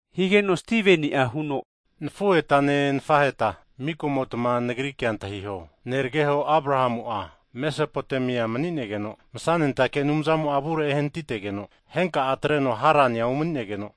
Higeno Stiveni'a huno, nafuhetane nafaheta mika'motma nagri kea antahiho, nerageho Abrahamu'a, Mesapotamia mani'negeno, Masanentake Anumzamo'a avure ehanatitegeno henka'a atreno vuno Harania umani'negeno,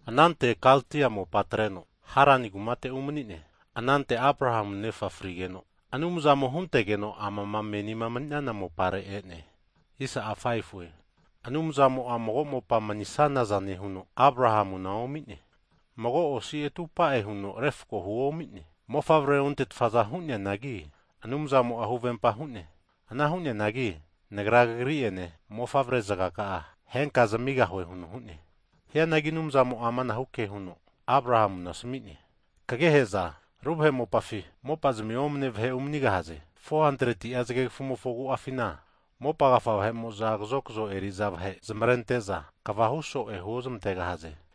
Anante Kaldia mopa atreno, Harani kumate umani'ne. Anante Abrahamu nefa'a frigeno, Anumzamo'a huntegeno amama menima emani'naza mopare e'ne. Anumzamo'a mago mopa manisana zane huno Abrahamuna omi'ne, mago osi atupa'e huno refako huomi'ne. Mofavrea onte'tfa hu'neanagi Anumzamo'a huvempa hu'ne, ana hu'neanagi Nagra kagri'ene mofavre zagaka'a henka zamigahue huno hu'ne. Hianagi Anumzamo'a amanahu ke huno Abrahamuna asami'ne, Kagehe'za ru vahe mopafi, mopazmi omane vahe umanigahaze. 400'a Zagegafu'mofo agu'afina, mopa agafa vahe'mo'za kazokzo eri'za vahe zamavarente'za, kva huso'e huozmantegahaze.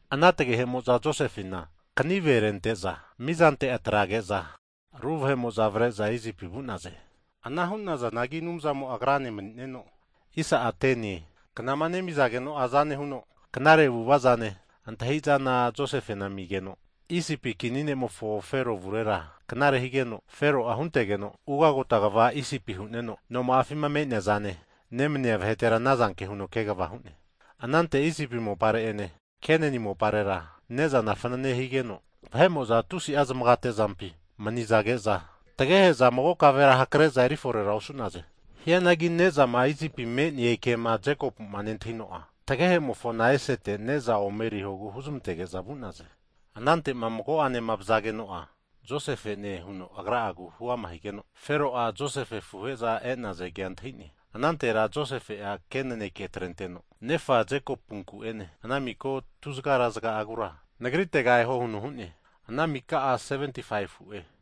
Ana tagehe'mo'za Josefena kanive rente'za mizante atrage'za ru vahe'mo'za avare'za Isipi vu'naze. Ana hu'nazanagi Anumzamo'a agrane mani'neno, knama nemizageno'a Anumzamo'a aza nehuno, knare avu'vazane, antahi'zana Josefena amigeno, Isipi kini ne'mofo Fero avurera knare higeno, Fero'a huntegeno ugagota kva Isipia hu'neno, noma'afima me'neazane nemania vahetera anazanke huno kegava hu'ne. Anante Isipi mopare'ene Kenani moparera ne'zana fanane higeno, vahe'mo'za tusi'a zamagate'zampi manizage'za, tagehe'za mago kavera hakare'za eri fore osu'naze. Hianagi ne'zana Isipi me'ne kema Jekopu'a nentahino'a, tagehemofona esete ne'za omerihogu huzmantege'za vu'naze. Anante'ma mago'ane (second time) vazageno'a, Josefe'ne huno agra'agu huama higeno, Fero'a, Josefe afuhe'za e'naza kea antahi'ne. Anantera Josefe'a ke naneke atrenteno nefa Jekopunku ene ana miko tuzagarazaga'agura nagritega eho huno hu'ne, ana mika'a 75fu'e.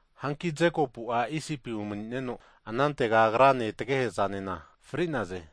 Hanki Jekopu'a Isipi umani'neno, anantega agrane tagehe'zanena fri'naze.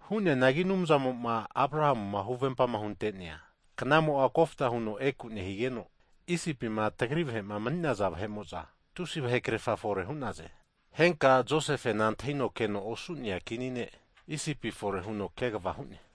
Hu'neanagi Anumzamo'ma, Abrahamuma huvempama hunte'nea knamo'a kofta huno eku nehigeno, Isipima tagri vahe'ma mani'naza vahe'mo'za tusi vahe krerfa fore hu'naze. Henka Josefema antahino keno osu'nea kini ne' Isipi fore huno kegava hu'ne.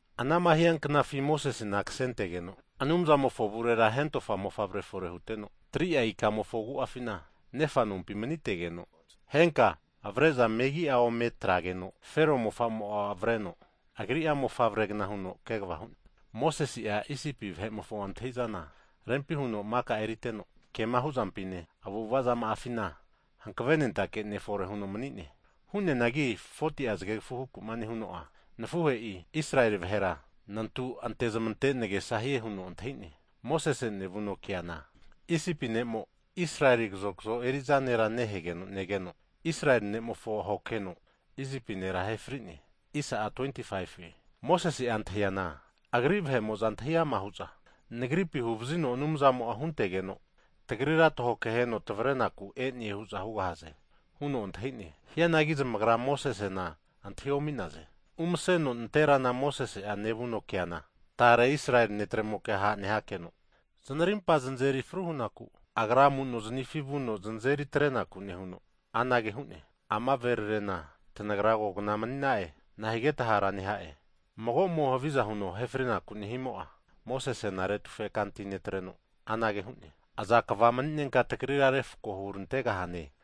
Anama hianknafi Mosesena kasentegeno Anumzamofo avurera hentofa mofavre fore hutegeno, 3'a ikamofo agu'afina kegava hazageno nefa nompi manitegeno, henka avare'za megi'a ometrageno, Fero mofamo'a avareno agri'a mofavregna huno kegava hu'ne. Mosese'a Isipi vahe'mofo antahi'zana rempi huno maka eriteno, kema hu'zampine, avu'ava'zama'afina hankave nentake ne' fore huno mani'ne. Hu'neanagi 40'a zagegafu huku'ma nehuno'a nafuhe'i, Israeli vahera nantu antezmante nagesahie huno antahi'ne. Mosese nevuno keana Isipi ne'mo, Israeli kazokzo eri'za nera nehegeno negeno, Israeli ne'mofo ahoke heno Isipi nera ahe fri'ne. Mosese'a antahiana agri vahe'mo'za antahi ama hu'za, nagripi huvazino Anumzamo'a huntegeno tagrira tahokeheno tavarenaku e'ne hu'za hugahaze huno antahine, hianagi zamagra Mosesena antahi omi'naze. Umaseno nanterana Mosese'a nevuno keana, tare Israeli ne'tremoke ha' nehakeno, zanarimpa zanazeri fru hunaku, agra amu'noznifi vuno znazeri atrenaku nehuno anage hu'ne, Ama verarena, tanagra kogna mani'na'e. Nahigeta hara neha'e? Hianagi magomo'ma havizama hunteno ahe frinaku nehimo'a, Mosesena retufe kanti netreno anage hu'ne, Aza kva mani'nenka tagrira refako hurantegahane?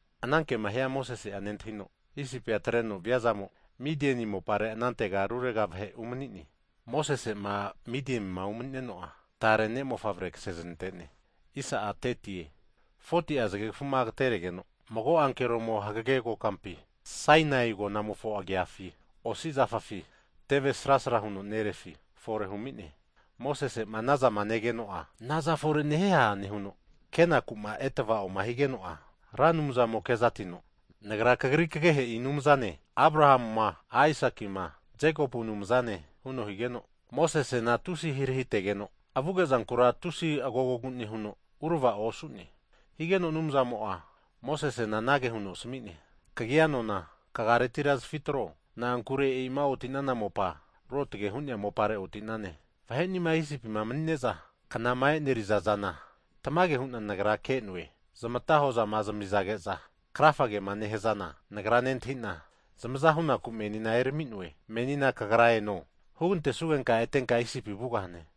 Ana kema hia Mosese'a nentahino, Isipia atreno viazamo, Midieni mopare anantega rurega vahe umani'ne. Mosese'ma Midienima umani'neno'a, tare ne'mofavre ksezanante'ne. Hagi 40'a zagegfuma agateregeno mago ankeromo hagage kokampi Sainai agonamofo agiafi osi zafafi tevesrasra huno nerefi fore humi'ne. Mosese'ma anazama negeno'a, naza fore nehieha nehuno kenakuma eravaoma higeno'a, Ra Anumzamo'a kezatino, Nagra kagri kagehe'i Anumzane, Abrahamuma Aisakima Jekopu Anumzane, huno higeno, Mosesena, tusi ahirahitegeno avuge'zankura tusi agogogu nehuno avua onke'ne. Higeno Anumzamo'a Mosesena anage huno asami'ne, Kagia nona, kagaretira zafitro, na'ankure e'ima oti'nana mopa, Ruotge hu'nea mopare oti'nane. Vahe'nima Isipima manine'za knama e'neriza zana tamage hu'na Nagra ke'noe, zamata hozama zamizage'za krafa kema nehazana Nagra nentahina zamaza hunaku menina erami'noe. Menina kagra eno, hugantesugenka, etenka Isipi vugahane.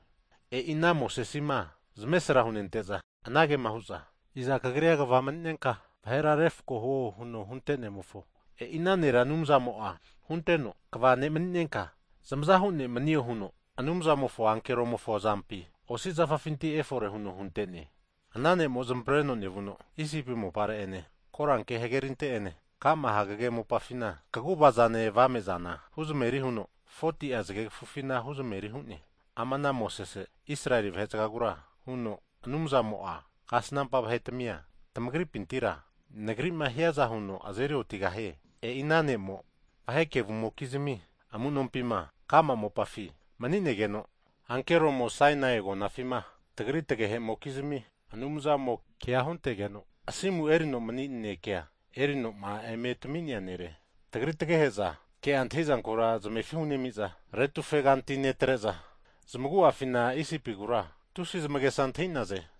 E'ima ana Mosesima zamesra hunente'za, anagema hu'za, Iza kagrira kva mani'nenka vahera refko huo huno huntenemofo, e'i ana nera Anumzamo'a hunteno, kva ne' mani'nenka, zamazahu ne' manio huno Anumzamofo ankeromofo azampi osi zafafinti efore huno hunte'ne, Ana ne'mo zamavareno nevuno Isipi mopare ene koranke hagerinte'ene ka'ma hagege mopafina kaguvazane avame'zana 40'a zagegfufina huzmeri hu'ne. Ama ana Mosese, Israeli vahe'zagagura huno, Anumzamo'a kasnampa vahetmia tamagripintira nagri'ma hiaza huno azeri otigahie. E'i ana ne'mo, vahe kevumokizmi amu'nompima ka'ma mopafi mani'negeno ankeromo Sainai agonafina tagri tagehemokizmi Anumzamo'a kea huntegeno asimu erino mani naneke erino'ma eme tami'nea nere. Tagri tagehe'za ke'a antahizanku zamefi hunemi'za, retufeganti netre'za, zamagu'afina Isipigura tusi zamagesa antahi'naze.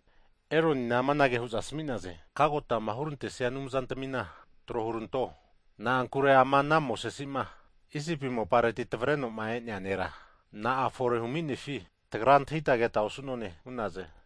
Eronina amanage hu'za asmi'naze, Kagotama hurantesia anumzantamina tro huranto, na'ankure ama ana Mosese'ma Isipi mopareti tavarenoma e'nea nera na'a fore huminefi tagra antahita keta osu'none hu'naze.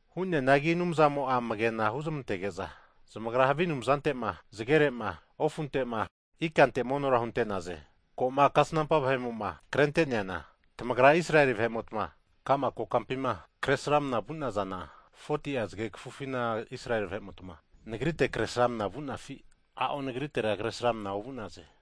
Hu'neanagi Anumzamo'a amagena huzmantege'za, zamagra havi anumzantema zagere'ma, ofunte'ma ikante monora hunte'naze, ko'ma kasnampa vahe'moma krente'neana tamagra Israeli vahe'mota ka'ma kokampima 40'a zage kafufima ofa nehuta Kresramana vu'nazana Israeli vahemota Nagrite Kresramana vu'nafi? A'o. Nagrite Kresramana ovu'naze.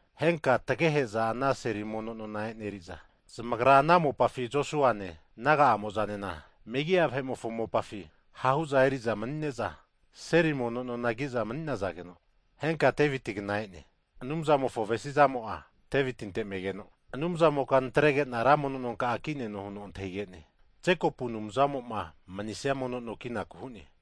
Henka tagehe'mokizimi mofavreramimo'za ana seli mono nona e'neriza, zamagra ana mopafi Josua'ene naga'amo'zanena megi'a vahe'mofo mopafi ha'hu'za eri'za mani'neza, seli mono nona kiza mani'nageno henka Devitinkna e'ne. Anumzamofo avesi zamo'a Devitinte megeno, Anumzamoka natregena ra mono nonka'a kineno huno antahige'ne, Jekopu Anumzamo'ma manisia no kinaku hu'ne.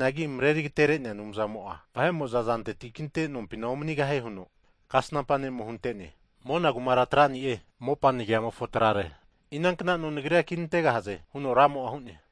Hu'neanagi, Mareri Agatere'nea Anumzamo'a vahe'mo azanteti kinte nompina omanigahie huno, Kasnampa ne'mo hunte'ne, Mona kumara trani'e, ama mopa nagiamofo trare, inankna no Nagrira kinantegahaze? Huno Ramo'a hu'ne.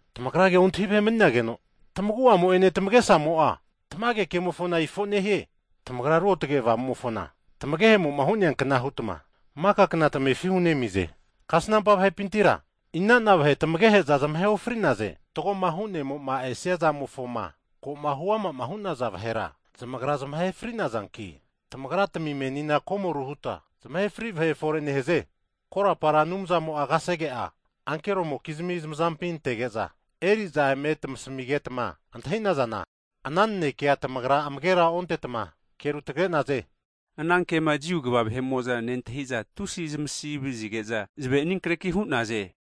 Tamagra ke ontahi vahe mani'nageno tamaguamo ene tamagesamo'a tamage kemofona ifo nehie! Tamagra Ruotge Avamumofona tamagehemo'zama hu'naza kna hutma maka kna tamefi hunemize! Kasnampa vahepintira ina'na vahe tamagehe'za zamahe ofri'naze? Fatgoma Hu'nemo'ma esia zamofoma ko'ma huama'ma hu'naza vahera, zamagra zamahe fri'nazanki, tamagratmi menina komoru huta zamahe fri'naze. Korapara Anumzamo'a kasege'a ankero'mokizmi zamazampi antege'za, eri'za eme tamizageta enerita, ana nanekea tamagra amagera ontetma kea rutagare'naze. Ana kema Jiu kva vahe'mo'za nentahi'za, tusi zamasi vazige'za zamavera aninkreki hu'naze.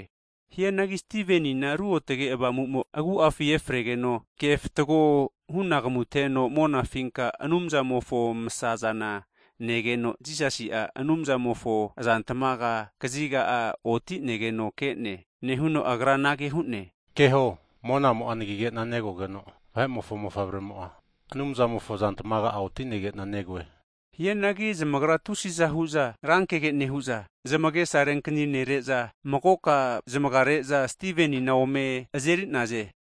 Hianagi Stivenina Ruotge Avamumo agu'afi efregeno, kefatgo hunagamuteno monafinka Anumzamofo masa'zana negeno, Jisasi'a Anumzamofo azantamaga kaziga'a oti'negeno ke'ne. Nehuno agra anage hu'ne, Keho Monamo'a anagige'na negogeno, Vahe'mofo mofavremo'a Anumzamofo azantmaga'a oti'negena negoe. Hianagi zamagra tusi'za hu'za rankege nehu'za, zamagesa renkani nere'za, magoka zamagare'za Stivenina ome azeri'naze.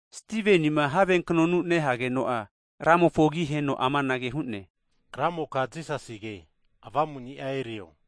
Stivenima have knonu nehageno'a, Ramofo agi aheno amanage hu'ne, Ramoka Jisasige, avamuni'a erio!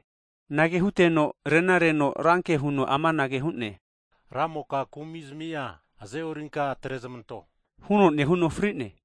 Anage huteno rena reno ranke huno amanage hu'ne, Ramoka kumi'zami'a aze'orinka atrezmanto, huno nehuno fri'ne.